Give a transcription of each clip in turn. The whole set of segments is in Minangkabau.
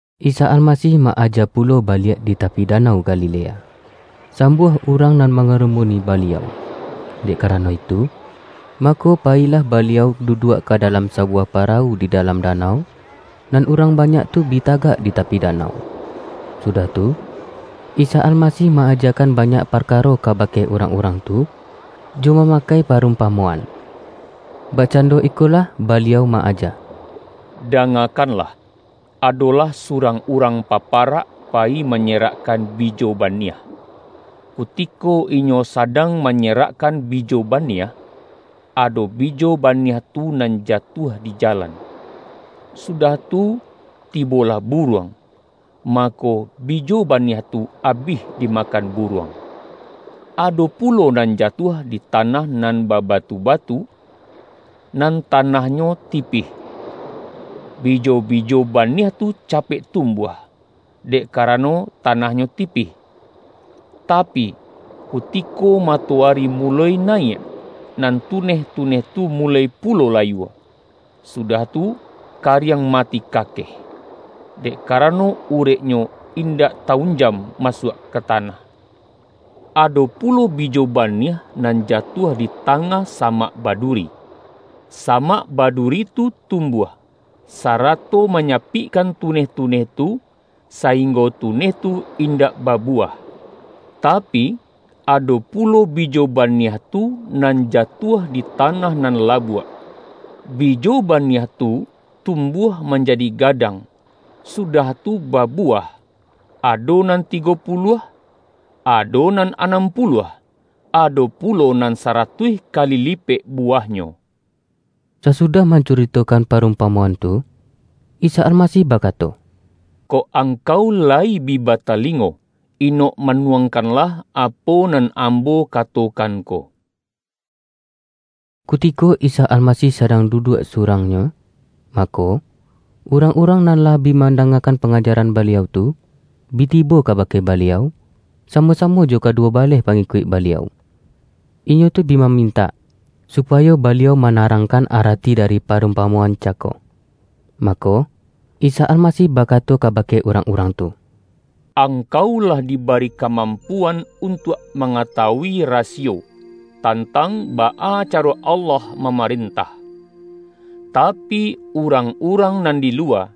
Isa Almasih ma-aja pulo baliak di tapi danau Galilea. Sambuah urang nan mangarumuni Baliau. Dek karano itu, mako payilah Baliau du-duak ka dalam sabuwah parawu di dalam danau, nan urang banyak tu bi tagak di tapi danau. Sudah tu, Isa Almasih ma-ajakan banyak parkaro kabake urang-urang tu, jo mamakai parumpamoan. Bakcando ikolah Baliau ma-aja. ”Dangakanlan! Adolah surang urang paparak payi manyerakkan bi-jo baniah. Kutiko inyo sadang ma-nyerakkan bijo baniah, ado bijo ba-niah tu nan jatuah di jalan. Sudah tu tibolah buruang, mako, bijo baniah tu abih dimakan buruang. Ado pu-lo nan jatuah di tanah nan babatu-ba-tu, nan tanahnyo tipih. Bijo-bijo ba-niah tu capek tumbuah, dek karano tanahnyo tipih, tapi, kutiko matoari muloi nayiak, nan tuneh-tuneh tu mu-loi pulo layua, sudah tu, kariang ma-ti kakeh, dek karano ureknyo indak ta-unjam masuak ka tanah. Ado pu-lo bijo baniah nan jatuah di tangah samak baduri. Samak baduri tu tum-buah, sarato manyapikkan tuneh-tu-neh tu, sainggo tuneh tu indak babu-wah. Tapi, ado pulo bijo baniah tu, nan jatuah di tanah nan labuak. Bijo baniah tu tumbuah manjadi gadang, sudah tu babuwah, ado nan tigo pu-luah, ado nan anam puluah, ado pulo nan saratuih kali lipek buwahnyo.” Sasudah mancuritokan parumpa-moan tu, Isa Almasih bakato,”Kok ang-kau layi bi batalingo, inok manuang-kanlah apo nan Ambo katokan ko!” Kutiko Isa Almasih sadang duduak surang-Nyo, mako, urang-urang nan lah bi mandangakan pangajaran Baliau tu, bi tibo kabake Baliau, samo-samo jo kaduwo baleh pangikuik Baliau. Inyo tu bi mamintak, supayo Baliau mana-rangkan arati dari parumpamoan ca-ko. Mako, Isa Almasih bakato kaba-ke urang-urang tu,”Angkau lah dibari kamampuan untuak mangatawui rasi-yo, tantang baa caro Allah mamaren-tah. Tapi, urang-urang nan di luwa,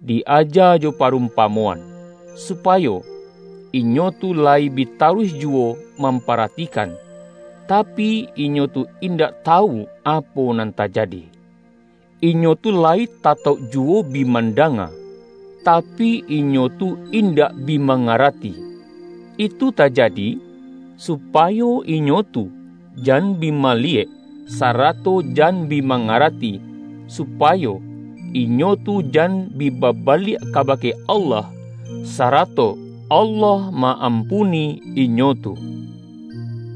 di-aja jo parumpamoan, supayo, ’Inyo tu layi bi taruih juwo mamparatikan, tapi, inyo tu indak tawu apo nan tajadi, inyo tu layi tatauk juwo bi mandanga, tapi, inyo tu indak bi mangarati, itu tajadi, supayo inyo tu jan bi maliyek, sarato jan bi mangarati, supayo, inyo tu jan bi babaliak kabake Allah, sarato Allah ma-ampuni inyo tu.’”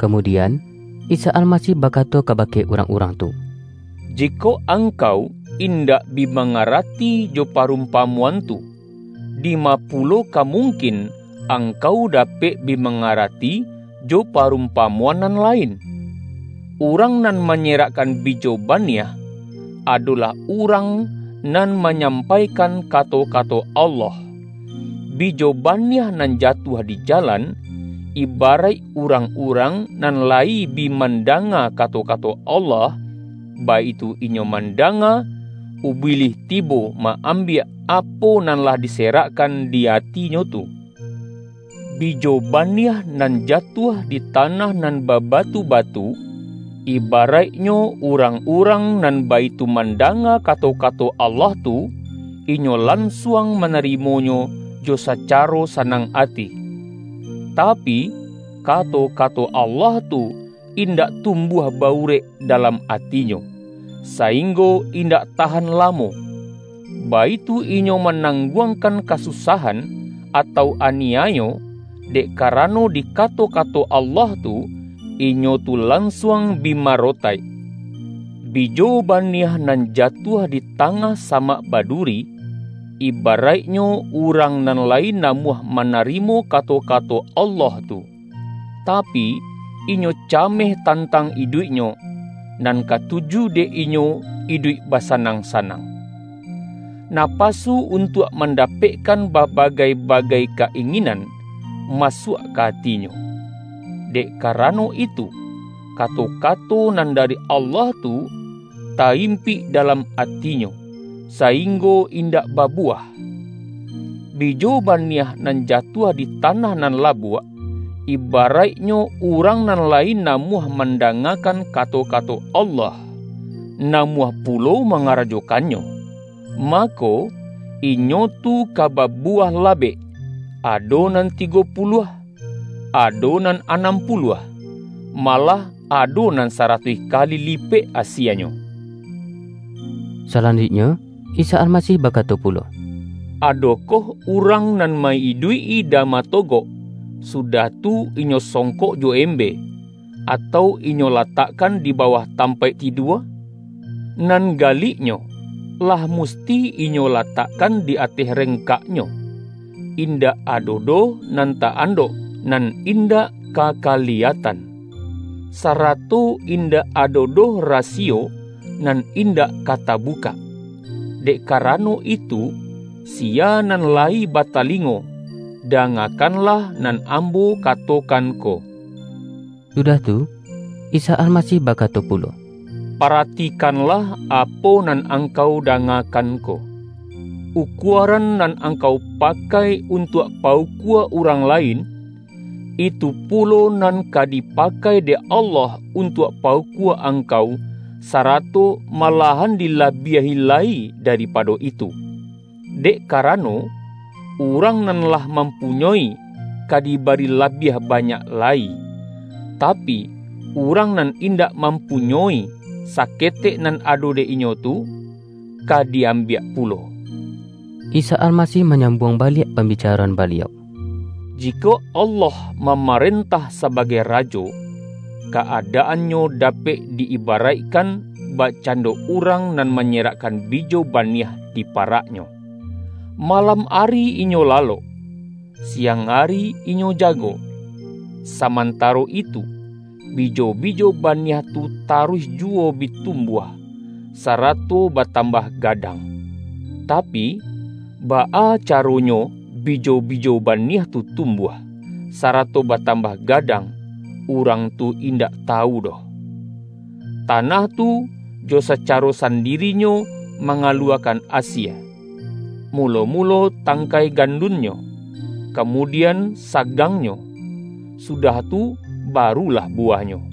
Kamudian, Isa Almasih bakato ka-bake urang-urang tu,”Jikok angkau indak bi mangarati jo parumpamo-an tu, dima pulo ka mungkin angkau dapek bi mangarati, jo parumpamo-an nan lain? Urang nan manyerak-kan bijo baniah, adolah urang nan ma-nyampaikan kato-kato Allah. Bijo baniah nan jatuah di jalan, ibaraik urang-urang nan layi bi mandanga kato-kato Allah. Baitu inyo manda-nga, Ubilih tibo ma-ambiak apo nan lah diserakkan di atinyo tu. Bijo ba-niah nan jatuah di tanah nan baba-tu-batu, ibaraiknyo, urang-urang nan baitu mandanga kato-kato Allah tu, inyo lansuang manarimonyo jo saca-ro sanang ati. Tapi, kato-kato Allah tu, indak tumbuah ba-urek dalam ati-nyo, sainggo indak tahan lamo. Baitu inyo manangguangkan kasusahan, atau aniayo, dek karano di kato-kato Allah tu, inyo tu lansuang bi maro-taik. Bijo baniah nan jatuah di ta-ngah samak baduri, ibaraiknyo, urang nan layi namuah manarimo kato-ka-to Allah tu, tapi, inyo cameh tan-tang iduiknyo, nan katuju dek inyo iduik basanang-sanang. Napasu un-tuak mandapekkan babagai-bagai ka-inginan, masuak ka atinyo. Dek ka-rano itu, kato-kato nan dari Allah tu, ta-impik dalam atinyo, sainggo indak babuwah. Bijo baniah nan jatuah di tanah nan labuak, ibaraiknyo, urang nan layi namuah mandangakan ka-to-kato Allah, namuah pulo manga-rajokannyo, mako, inyo tu ka babu-wah labek, ado nan tigo puluah, ado nan anam puluah, malah ado nan sa-ratuih kali lipek asienyo.” Salanjuiknyo Isa Almasih bakato pulo,”Adokoh urang nan ma-iduik-i dama togok, sudah tu, inyo songkok jo embe, atau inyo latakkan di bawah tampaik tidua? Nan galiknyo, lah mus-ti inyo latakkan di ateh rengkaknyo. Indak ado doh nan ta-andok, nan in-dak ka kaliyatan; sarato indak ado doh rasiyo, nan indak ka tabukak. Dek karano itu, siya nan layi batalingo, da-ngakanlah nan Ambo katokan ko!” Sudah tu, Isa Almasih bakato pu-lo,”Paratikanlah apo nan angkau da-ngakan ko! Ukuaran nan angkau pakai untuak pa-ukua urang lain, itu pulo nan ka dipakai dek Allah untuak pa-ukua angkau sarato malahan dila-biahi lai daripado itu. Dek karano, urang nan lah mampunyoi, ka dibari labiah banyak lai; tapi, urang nan in-dak mampunyoi, saketek nan ado dek inyo tu, ka di-ambiak pulo.” Isa Almasih manyambuang baliak pambicaroan Baliau,”Jikok Allah ma-marentah sabagai Rajo, ka-adaannyo dapek di-ibaraikkan, bakcando urang nan manyerakkan bijo baniah di pa-raknyo. Malam ari inyo lalok; siang ari inyo jago. Samantaro itu, bijo-bijo baniah tu taruih juwo bi tumbuah, sarato batambah gadang. Tapi, baa caro-nyo bijo-bijo baniah tu tumbuah, sarato batambah gadang, urang tu indak tawu doh. Tanah tu, jo sacaro sandirinyo mangaluwakan asie: mulo-mulo tang-kai gandunnyo, kamudian sagangnyo, sudah tu barulah buwahnyo.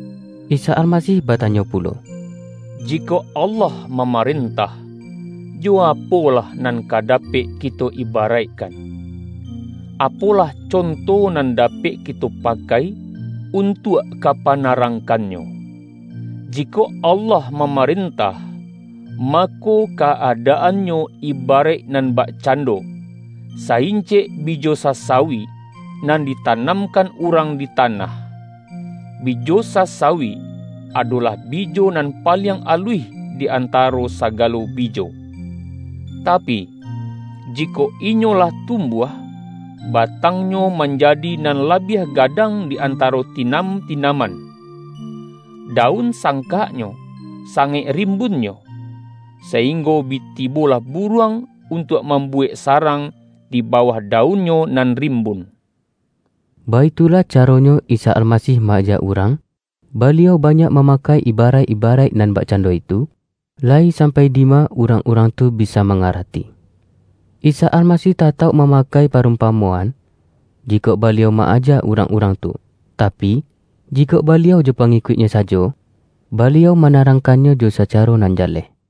Isa Almasih batanyo pulo,”Jikok Allah mamarentah, jo apolah nan ka dapek kito ibaraikkan? Apolah conto nan dapek kito pakai, untuak ka pana-rangkannyo? Jikok Allah mamaren-tah, mako, ka-adaannyo ibaraik nan bakcando: Sa-incek bijo sasawi, nan ditanamkan urang di tanah. Bijo sa-sawi, adolah bijo nan paliang aluih di antaro sagalo bijo. Tapi, jikok inyo lah tumbuah, batangnyo manjadi nan labiah gadang di antaro tinam-tinam-an. Daun sangkaknyo, sangaik rim-bunnyo, sainggo bi tibolah buruang, untuak mambuwek sarang di bawah daunnyo nan rimbun.” Baitulah caronyo Isa Almasih ma-aja urang, Baliau banyak mamakai iharaik-ibaraik nan bakcando itu, layi sampai dima urang-urang tu bisa ma-ngarati. Isa Almasih tatauk mama-kai parumpamoan, jikok Baliau ma-aja urang-urang tu. Tapi, jikok Baliau jo pangikuik-Nyo sajo, Baliau mana-rangkannyo jo sacaro nan jaleh.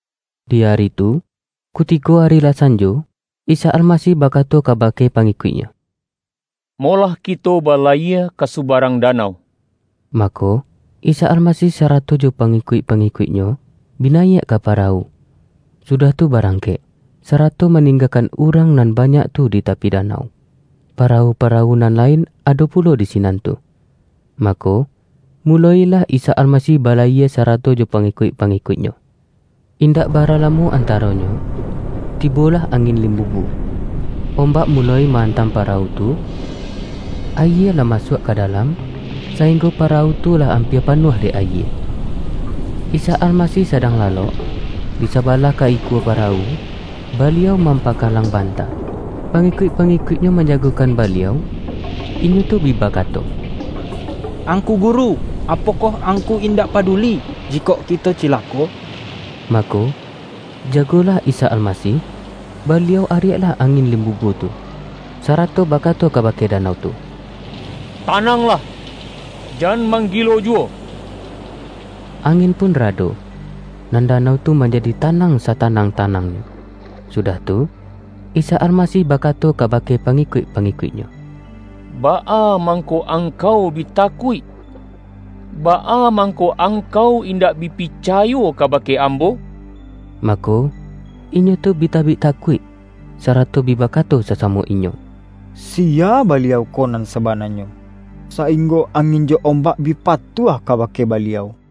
Di ari tu, kutiko ari lah sanjo, Isa Almasih bakato kabake pangikuik-Nyo,”Molah kito balayie ka subarang danau.” Mako, Isa Almasih sarato jo pa-ngikuik-pangikuik-Nyo, bi nayiak ka parawu, sudah tu barangkek, sarato maninggakan urang nan banyak tu di tapi danau. Parawu-parawu nan lain ado pulo di sinan tu. Mako, muloilah Isa Almasih balayie sarato jo pangi-kuik-pangikuik-Nyo. indak bara la-mo antaronyo, tibolah angin limbubu. Ombak muloi ma-antam parawu tu, ayie lah masuak ka dalam, sainggo pa-rawu tu lah ampia panuah dek ayie. Isa Almasih sadang lalok, di saba-lah ka ikua parawu, Baliau mampaka-lang banta. Pangikuik-pangikuik-Nyo manjagokan Baliau. Inyo tu bi baka-to,”Angku Guru, apokoh Angku in-dak paduli, jikok kito cilako?” Mako, jagolah Isa Almasih, Baliau ariaklah angin limbubu tu, sarato ba-kato kabake danau tu,”Tananglah, jan manggilo juwo!” Angin pun rado, nan danau tu manjadi tanang satanang-tanangnyo. Sudah tu, Isa Almasih bakato kabake pangikuik-pangikuik-Nyo,”Baa mangko angkau bi takuik? Baa mangko angkau indak bi picayo kabake Ambo?” Mako, inyo tu bi tabik takuik, sa-rato bi bakato sasamo inyo,”Siya Baliau ko nan sabananyo, sainggo angin jo ombak bi patuah kabake Baliau.”